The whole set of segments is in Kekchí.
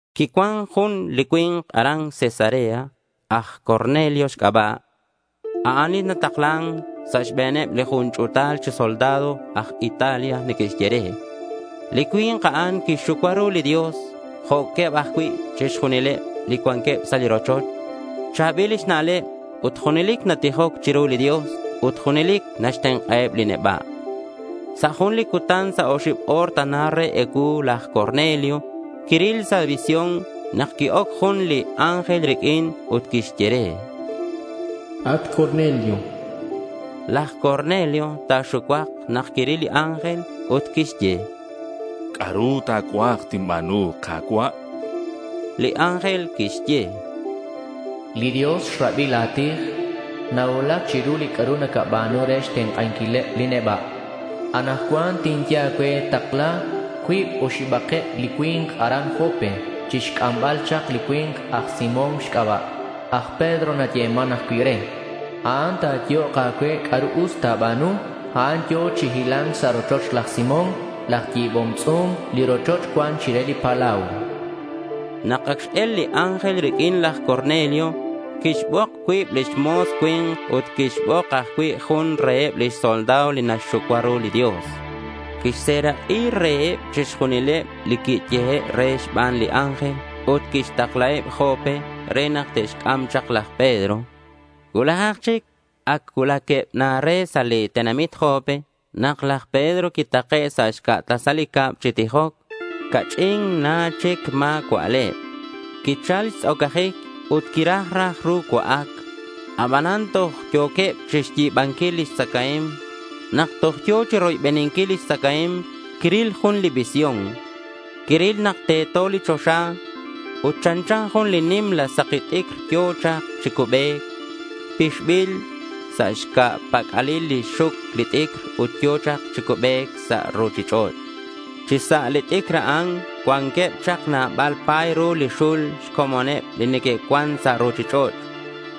Quicuan jun li cui̱nk aran Cesarea aj Cornelio xc'aba'. A'an li nataklan sa' xbe̱neb jun ch'u̱tal chi soldado aj Italia neque'xye re. Li cui̱nk a'an quixxucua ru li Dios jo'queb ajcui' chixjunileb li cuanqueb sa' li rochoch. Cha̱bil xna'leb ut junelic natijoc chiru li Dios ut junelic naxtenk'aheb li neba'. Sa' jun li cutan sa' oxib o̱r tana re ecuu laj Cornelio quiril sa' visión nak qui-oc jun li ángel riq'uin ut quixye re: —At Cornelio, chan. Laj Cornelio ta̱xucuak nak quiril li ángel ut quixye: —C'a'ru ta̱cuaj tinba̱nu, Ka̱cua'.— Li ángel quixye: —Li Dios xrabi la̱ tij. Nacuulac chiru li c'a'ru nacaba̱nu re xtenk'anquileb li neba'. Anakcuan tinye a̱cue takla cuib oxibakeb li cui̱nk aran Jope chixc'ambal chak li cui̱nk aj Simón xc'aba'. Aj Pedro nayeman ajcui' re. A'an ta̱yehok a̱cue c'a'ru us ta̱ba̱nu. A'an yo̱ chi hila̱nc sa' rochoch laj Simón laj yi̱bom tz'u̱m. Li rochoch cuan chire li palau, chan li ángel. Nak ac x-el li ángel riq'uin, laj Cornelio quixbok cuib lix mo̱s cui̱nk ut quixbok ajcui' jun reheb lix soldado li naxxucua ru li Dios. Quixserak'i reheb chixjunileb li quiyehe' re xban li ángel ut quixtaklaheb Jope re nak te'xc'am chak laj Pedro. Cuulajak chic ac cuulaqueb na re sa' li tenamit Jope nak laj Pedro quitake' sa' xca' tasal li cab chi tijoc. Ca'ch'in na chic ma̱ cua'leb. Quichal xtz'ocajic ut quiraj raj ru cua'ac. Abanan toj yo̱queb chixyi̱banquil lix tzacae̱mk. Nak toj yo̱ chiroybeninquil lix tzacae̱mk, quiril jun li visión. Quiril nak teto li choxa ut chanchan jun nimla saki t'icr yo̱ chak chi cubec. Pixbil sa' xca̱ pac'alil lix xuc li t'icr ut yo̱ chak chi cubec sa' ruchich'och'. Chi sa' li t'icr a'an cuanqueb chak nabal pa̱y ru li xul xcomoneb li neque'cuan sa' ruchich'och'.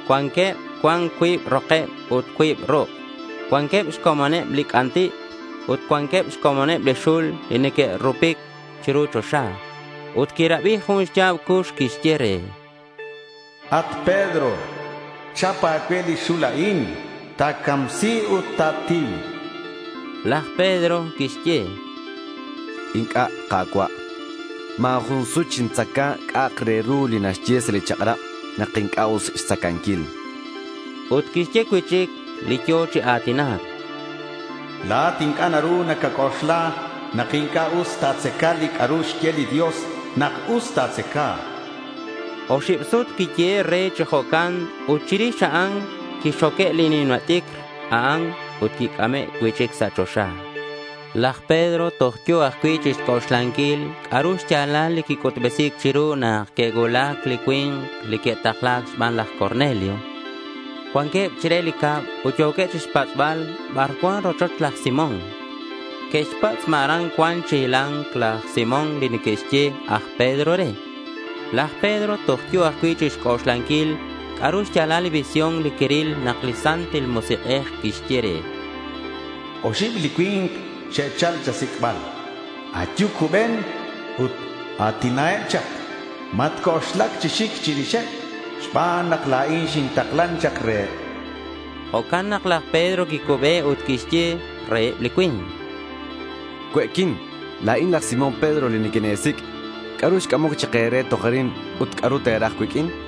Cuanqueb cuan cuib rokeb ut cuib ruk', cuanqueb xcomoneb li c'anti' ut cuanqueb xcomoneb li xul li neque'rupupic chiru choxa. Ut quirabi jun xya̱b cux quixye re: —At Pedro, chap a̱cue li xul a'in. Ta̱camsi ut ta̱tiu, chan. Laj Pedro quixye: —Inc'a', Ka̱cua'. Ma̱ jun sut xintzaca c'a'ak re ru li naxye sa' li chak'rab nak inc'a' us xtzacanquil, chan. Ut quixye cui'chic li yo̱ chi a̱tinac: —La̱at inc'a' naru nacac'oxla nak inc'a' us ta̱tzaca li c'a'ru xye li Dios nak us ta̱tzaca, chan. Oxib sut quiyehe' re chi jo'can ut chirix a'an quixoque li nimla t'icr a'an ut quic'ame' cui'chic sa' choxa. Laj Pedro toj yo̱ ajcui' chixc'oxlanquil c'a'ru xya̱lal li quic'utbesi̱c chiru nak que'cuulac li cui̱nk li que'takla̱c xban laj Cornelio. Cuanqueb chire li cab ut yo̱queb chixpatz'bal bar cuan li rochoch laj Simón. Que'xpatz' ma aran cuan chi hila̱nc laj Simón li neque'xye aj Pedro re. Laj Pedro toj yo̱ ajcui' chixc'oxlanquil c'a'ru xya̱lal li visión li quiril nak li Santil Musik'ej quixye re: —Oxib li cui̱nk xe'chal cha̱sic'bal. Ayu, cuben ut a̱tinaheb chak. Matc'oxlac chi xic chirixeb xban nak la̱in xintaklan chak reheb, chan. Jo'can nak laj Pedro quicube ut quixye reheb li cui̱nk: —Cue'quin. La̱in laj Simón Pedro li niquine̱sic'. ¿C'a'ru xc'amoc chak e̱re toj arin ut c'a'ru te̱raj cuiq'uin? chan.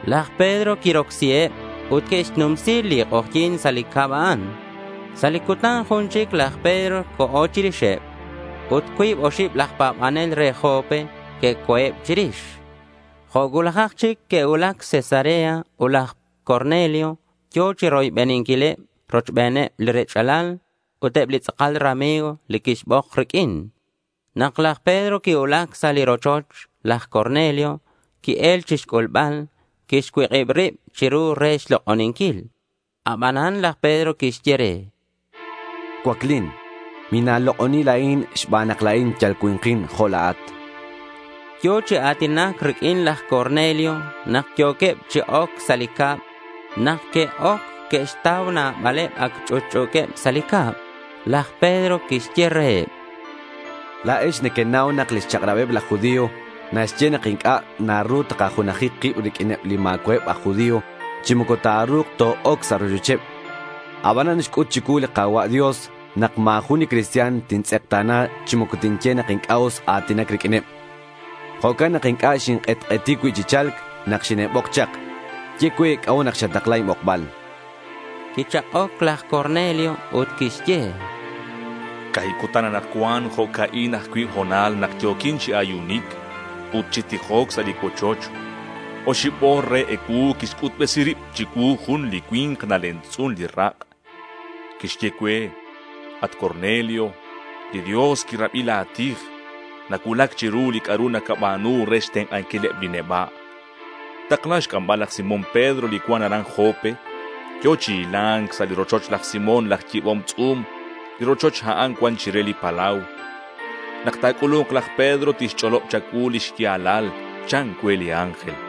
Laj Pedro quirocsiheb ut que'xnumsi li k'ojyi̱n sa' li cab a'an. Sa' li cutan jun chic laj Pedro co̱ chirixeb. Ut cuib oxib laj pa̱banel re Jope que'co̱eb chirix. Jo' cuulajak chic que'cuulac Cesarea ut laj Cornelio yo̱ chiroybeninquileb rochbeneb li rech'alal ut eb li tz'akal rami̱g li quixbok riq'uin. Nak laj Pedro quicuulac sa' li rochoch, laj Cornelio qui-el chixc'ulbal. Quixcuik'ib rib chiru re xlok'oninquil. Abanan laj Pedro quixye re: —Cuaclin. Mina̱lok'oni la̱in xban nak la̱in yal cui̱nkin jo' la̱at, chan. Yo̱ chi a̱tinac riq'uin laj Cornelio nak yo̱queb chi oc sa' li cab. Nak que'oc, que'xtau nabaleb ac ch'utch'u̱queb sa' li cab. Laj Pedro quixye reheb: —La̱ex nequenau nak lix chak'rabeb laj judío naxye nak inc'a' naru takajunaji kib riq'uineb li ma̱cua'eb aj judío chi moco ta̱ru̱k to-oc sa' rochocheb. Abanan xc'ut chicuu li Ka̱cua' Dios nak ma̱ jun li cristian tintz'ekta̱na chi moco tinye nak inc'a' us a̱tinac riq'uineb. Jo'can nak inc'a' xink'etk'eti cuib chi cha̱lc nak xine'xbok chak. Ye cue c'a'ut nak xatakla inbokbal, chan. Quichak'oc laj Cornelio ut quixye: —Ca̱hib cutan anakcuan jo'ca'in ajcui' ho̱nal nak yo̱quin chi ayunic ut chi tijoc sa' li cuochoch. Oxib o̱r re ecuu quixc'utbesi rib chicuu jun li cui̱nk nalemtz'un li rak'. Quixye cue, “At Cornelio, li Dios quirabi la̱ tij. Nacuulac chiru li c'a'ru nacaba̱nu re xtenk'anquileb li neba'. Takla xc'ambal laj Simón Pedro li cuan aran Jope. Yo̱ chi hila̱nc sa' li rochoch laj Simón laj yi̱bom tz'u̱m. Li rochoch a'an cuan chire li palau. Nak ta̱c'ulu̱nk laj Pedro, tixch'olob cha̱cuu li xya̱lal,” chan cue li ángel.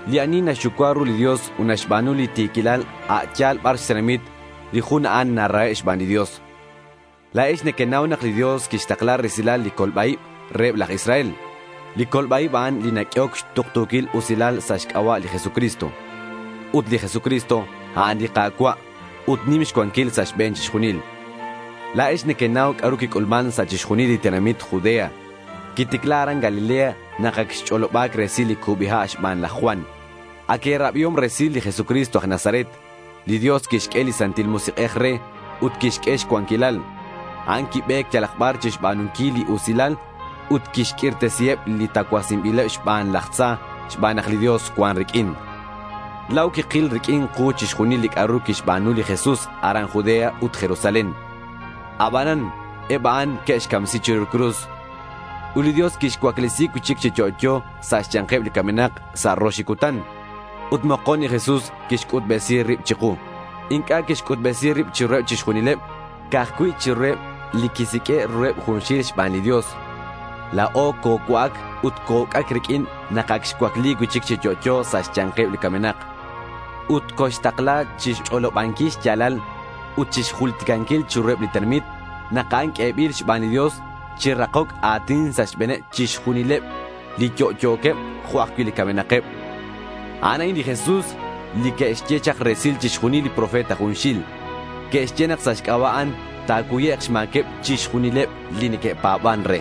Li ani naxxucua ru li Dios ut naxba̱nu li ti̱quilal a' yal bar xtenamit, li jun a'an narahe' xban li Dios. La̱ex nequenau nak li Dios quixtakla resil li colba-ib reheb laj Israel. Li colba-ib, a'an li naq'uehoc tuktu̱quil usilal sa' xc'aba' li Jesucristo. Ut li Jesucristo, a'an li Ka̱cua', ut nim xcuanquil sa' xbe̱n chixjunil. La̱ex nequenau c'a'ru quic'ulman sa' chixjunil li tenamit Judea. Quiticla aran Galilea nak ac xch'oloba̱c resil li cubi ha' xban laj Juan. Ac e̱rabiom resil li Jesucristo aj Nazaret. Li Dios quixq'ue li Santil Musik'ej re, ut quixq'ue xcuanquil. A'an quibe̱c yalak bar chixba̱nunquil li usilal ut chixq'uirtesinquileb li tacuasinbileb xban laj tza xban nak li Dios cuan riq'uin. La̱o quikil riq'uin ku chixjunil li c'a'ru quixba̱nu li Jesús aran Judea ut Jerusalén. Abanan eb a'an que'xcamsi chiru cruz. Ut li Dios quixcuaclesi cui'chic chi yo'yo sa' xya̱nkeb li camenak sa' rox li cutan. Ut mokon li Jesús quixc'utbesi rib chiku. Inc'a' quixc'utbesi rib chiruheb chixjunileb. Ca'aj cui' chiruheb li quisiq'ue' ruheb junxil xban li Dios. La̱o cocua'ac ut co-uc'ac riq'uin nak ac xcuacli cui'chic chi yo'yo sa' xya̱nkeb li camenak. Ut coxtakla chixch'olobanquil xya̱lal ut chixjulticanquil chiruheb li tenamit nak a'an q'uebil xban li Dios chi rakoc a̱tin sa' xbe̱neb chixjunileb, li yo'yo̱queb jo' ajcui' li camenakeb. A'an a'in li Jesús li que'xye chak resil chixjunileb li profeta junxil. Que'xye nak sa' xc'aba' a'an ta̱cuyek' xma̱queb chixjunileb li neque'pa̱ban re.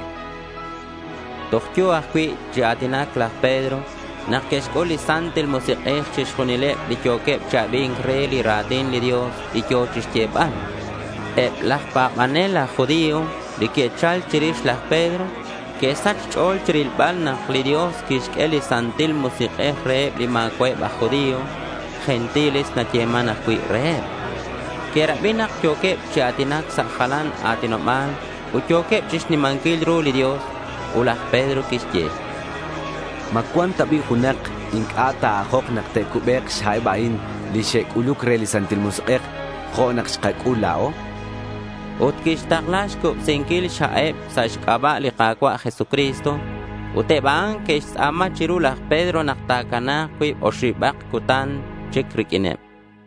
Toj yo̱ ajcui' chi a̱tinac laj Pedro nak que'xc'ul li Santil Musik'ej chixjunileb li yo̱queb chi abi̱nc re li ra̱tin li Dios li yo̱ chixyebal. Eb laj pa̱banel aj judío, li que'chal chirix laj Pedro, que'sach xch'o̱l chirilbal nak li Dios quixq'ue li Santil Musik'ej reheb li ma̱cua'eb aj judío. Gentiles nayeman ajcui' reheb. Que'rabi nak yo̱queb chi a̱tinac sa' jalan a̱tinoba̱l ut yo̱queb chixnimanquil ru li Dios. Ut laj Pedro quixye: —¿Ma cuan ta bi' junak inc'a' ta̱ajok nak te'cubek' xha'eb a'in li xe'c'uluc re li Santil Musik'ej, jo' nak xkac'ul la̱o? chan. Ut quixtakla xcubsinquil xha'eb sa' xc'aba' li Ka̱cua' Jesucristo. Ut eb a'an que'xtz'a̱ma chiru laj Pedro nak ta̱cana̱k cuib oxibak cutan chic riq'uineb.